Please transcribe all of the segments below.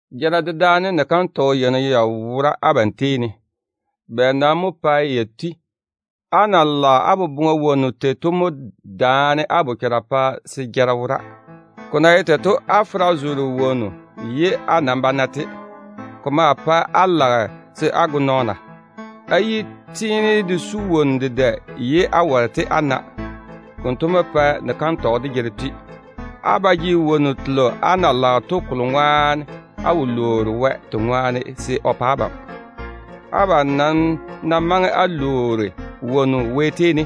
Jara dedaane ni-kantɔgɔ yeini ya wora abam tei ne. Bɛ nam mo pae ya tui? Á na lage á boboŋa wonnu tei to mo tei á bochara jege daanem, pa se jara wo á wone. Ko na ye tei to, á fera zoore wonnu ye á nam ba na-te. Ko maa pae á lage se á go nɔɔna. Á yi tiini de su wonnu dedɛ ye á ware-te á na. Konto mo pae kantɔgɔ de jara tui á tetare ne. Á ba jege wonnu telo á na lage to kolo ŋwaane á wo lwoori Wɛ te ŋwaane se o pa abam. Abam nam ná maŋe á lwoori wonnu Wɛ tei ne,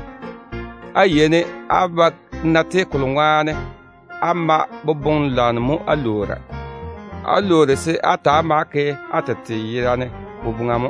á yeini á ba na-te, á na mae boboŋ-lwanno mo á lwoora to ŋwaane. Á lwoori se á ta‑á ma-te á ke á tete yerane boboŋa mo.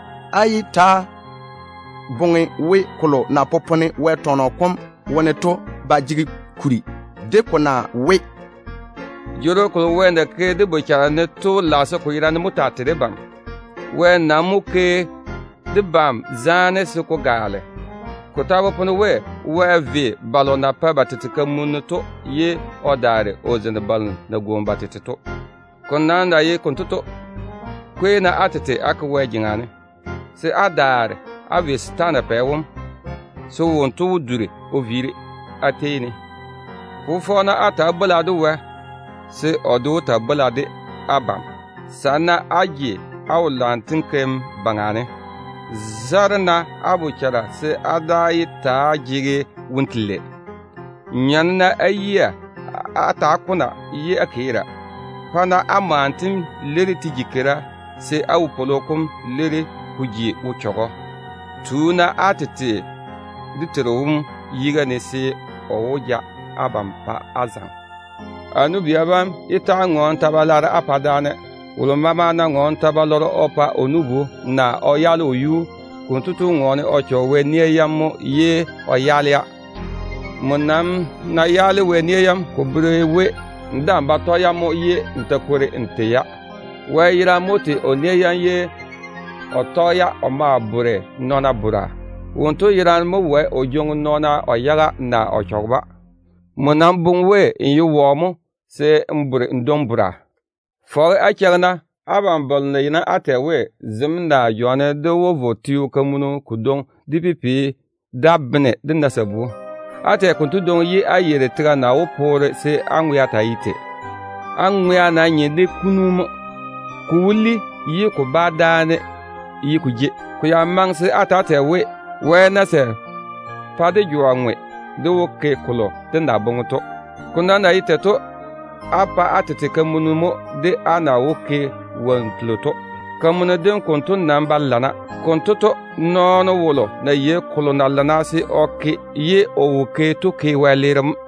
Á yé ta‑á boŋe we kolo na popone Wɛ tɔnɔ kom wone to ba jege kuri, de ko na we, “Jworo kolo Wɛ na ke dé bochara ne to lage se ko yerane mo taa tei debam.” Wɛ nam mo ke debam zaane se ko gaale. Ko ta popone we: “Wɛ ve balo na bere ba tete kamunim to, ye o daare o ke zaane balo na tu ba tete to yuu ne.” Ko nam na ye konto to, kwei-na á tete á ke Wɛ jeŋa ne, se á daare á ve setaana pɛ wom, se wonto wó duri o viiri á tei ne. Fofɔ-na á twɛ Wɛ tei, se o de wó taa bwola de abam. Sane-na á je á yage á wo-lwanno kikia yam. Kwɛ-na á bochara se á daa yé ta‑á jege woro telei. Nyɔne-na á yiga á ta‑á kona ye á keera. Pa-na á mwanno tem leiri te ji keira, se á wopwolo kom leiri ko ji wo-chechɔgɔ. Tu-na á tete dé Teiru wom yiga ne, se o laam wó ja abam o pa á zaŋe. A nu-bia bam, yé ta‑á ŋɔɔne-na ta-balwaaro á pa daane. Wolo maama ná ŋɔɔne ta-balɔrɔ o pa o nu-bu, naa o yaale o yuu, konto tu ŋɔɔne o chɔge Wɛ nia yam mo ye o yaale-ya. Nmo nam ná yaale Wɛ nia yam, ko bere we n daa‑n ba tɔge-ya mo, ye n jege dam ya baŋa ne. Wɛ yerane mo tei o nia yam ye o tɔge-ya o ma bore nɔɔna bora. Wonto yerane mo wae o jwoŋi nɔɔna o yaga, naa o chɔge-ba. Nmo nam boŋe we n ye wɔ mo se n di n dwoŋi taane? Fɔge á cheigi-na, abam balo na yeini á tɛ we, “Zem naa jwa ne dé wó vo teo kodwoŋi dé ke pipiu da bene dé na sabu” to. Á tɛ konto dwoŋi ye á yeiri tega na wó poore se á ŋwea taa ye tei. Á ŋwea nam nye de kunu mo. Ko wó li ye ko bá dáane ye ko jei. Ko ya maŋe se á ta‑á tɛ we, “Wɛ ná sɛ pa dé jwa ŋwe, dé wó ke kolo dé na boŋe to.” Ko nam na ye tei to, á pa á tete kamunni mo de á na wó ke wonnu telo to. Kamunni dem konto nam ba lana. Konto to, nɔɔno wolo ná yei kolo na lana se o ke to, ye o ná wo ke, kotu ke wɛleere mo.